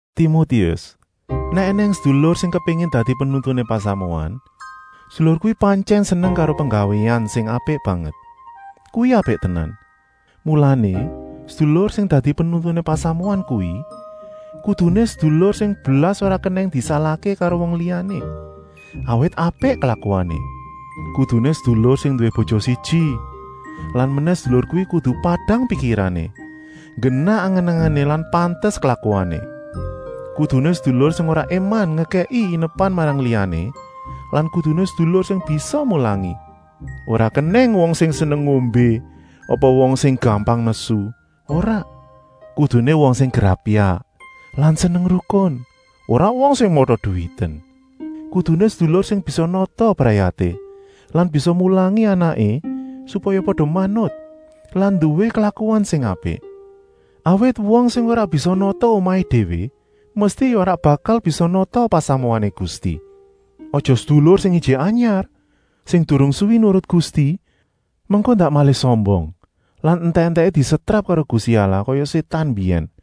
Timotius, nèk ènèng sedulur sing kepéngin dadi penuntuné pasamuan, sedulur kuwi pantyèn seneng karo penggawéan sing apik banget. Kuwi apik tenan. Mulané, sedulur sing dadi penuntuné pasamuan kuwi kuduné sedulur sing blas ora kenèng disalahké karo wong liyané, awit apik klakuané. Kuduné sedulur sing nduwé bojo siji lan menèh sedulur kuwi kudu padang pikirané, nggenah angen-angené lan pantes klakuané. Kuduné sedulur sing ora éman ngekèki inepan marang liyané lan kuduné sedulur sing bisa mulangi. Ora kenèng wong sing seneng ngombé apa wong sing gampang nesu, ora. Kuduné wong sing grapyak lan seneng rukun, ora wong sing mata-duwiten. Kuduné sedulur sing bisa nata brayaté lan bisa mulangi anaké supaya pada manut lan nduwé klakuan sing apik. Awit wong sing ora bisa nata omahé déwé mesti ya ora bakal bisa nata pasamuané Gusti. Aja sedulur sing ijik anyar, sing durung suwi nurut Gusti, mengko ndak malih sombong lan entèk-entèké disetrap karo Gusti Allah kaya Sétan mbiyèn.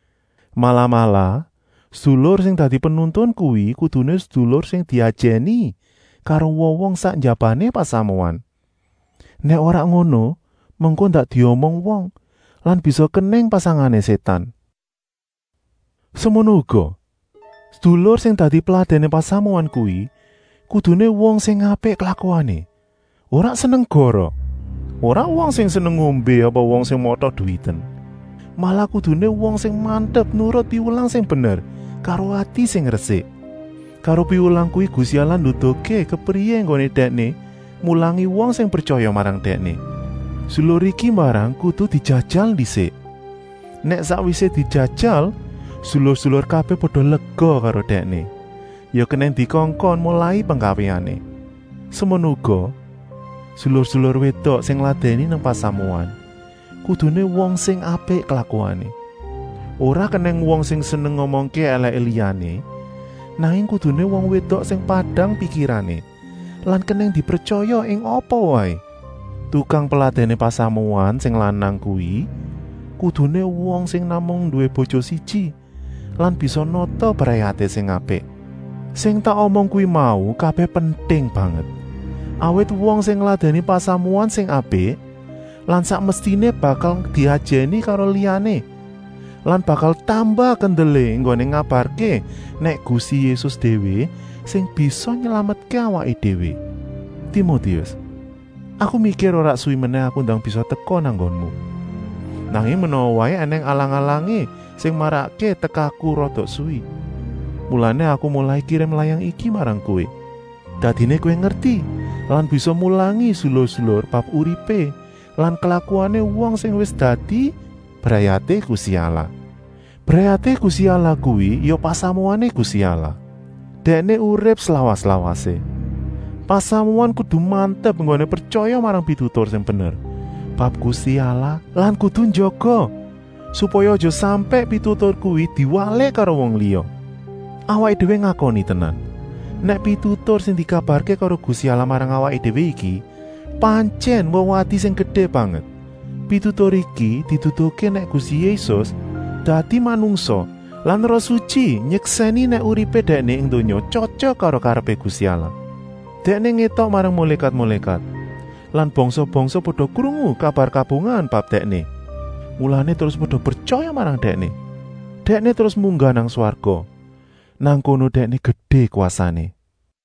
Malah-malah, sedulur sing dadi penuntun kuwi kuduné sedulur sing diajèni karo wong-wong sak njabané pasamuan. Nèk ora ngono, mengko ndak diomong wong lan bisa kenèng pasangané Sétan. Semono uga, sedulur sing dadi peladèné pasamuan kuwi kuduné wong sing apik klakuané lan ora seneng goroh. Ora wong sing seneng ngombé apa wong sing mata-duwiten. Malah kuduné wong sing mantep nurut piwulang sing bener karo ati sing resik. Karo piwulang kuwi Gusti Allah nduduhké kepriyé enggoné Dèkné mulangi wong sing pretyaya marang Dèkné. Sedulur iki mbarang kudu dijajal ndisik. Nèk sakwisé dijajal sedulur-sedulur kabèh pada lega karo dèkné, ya kenèng dikongkon molai penggawéané. Semono uga, sedulur-sedulur wédok sing ngladèni nang pasamuan, kuduné wong sing apik klakuané. Ora kenèng wong sing seneng ngomongké èlèké liyané, nanging kuduné wong wédok sing padang pikirané lan kenèng dipretyaya ing apa waé. Tukang peladèné pasamuan sing lanang kuwi kuduné wong sing namung nduwé bojo siji lan bisa nata brayaté sing apik. Sing tak omong kuwi mau kabèh penting banget, awit wong sing ngladèni pasamuan sing apik lan sak mestiné bakal diajèni karo liyané lan bakal tambah kendelé enggoné ngabarké nèk Gusti Yésus déwé sing bisa nylametké awaké déwé. Timotius, aku mikir ora suwi menèh aku ndang bisa teka nang nggonmu. Nanging menawa waé ènèng alang-alangané sing marakké tekaku rada suwi, mulané aku molai kirim layang iki marang kowé. Dadiné kowé ngerti lan bisa mulangi sedulur-sedulur bab uripé lan klakuané wong sing wis dadi brayaté Gusti Allah. Brayaté Gusti Allah kuwi ya pasamuané Gusti Allah. Dèkné urip slawas-lawasé. Pasamuan kudu mantep enggoné pretyaya marang pitutur sing bener bab Gusti Allah lan kudu njaga, supaya aja sampèk pitutur kuwi diwalik karo wong liya. Awaké déwé ngakoni tenan, nèk pitutur sing dikabarké karo Gusti Allah marang awaké déwé iki pantyèn wewadi sing gedé banget. Pitutur iki nduduhké nèk Gusti Yésus dadi manungsa lan Roh Sutyi nyeksèni nèk uripé Dèkné ing donya tyotyok karo karepé Gusti Allah. Dèkné ngétok marang mulékat-mulékat lan bangsa-bangsa pada krungu kabar kabungahan bab Dèkné, mulané terus pada pretyaya marang Dèkné. Dèkné terus munggah nang swarga, nang kono Dèkné gedé kwasané.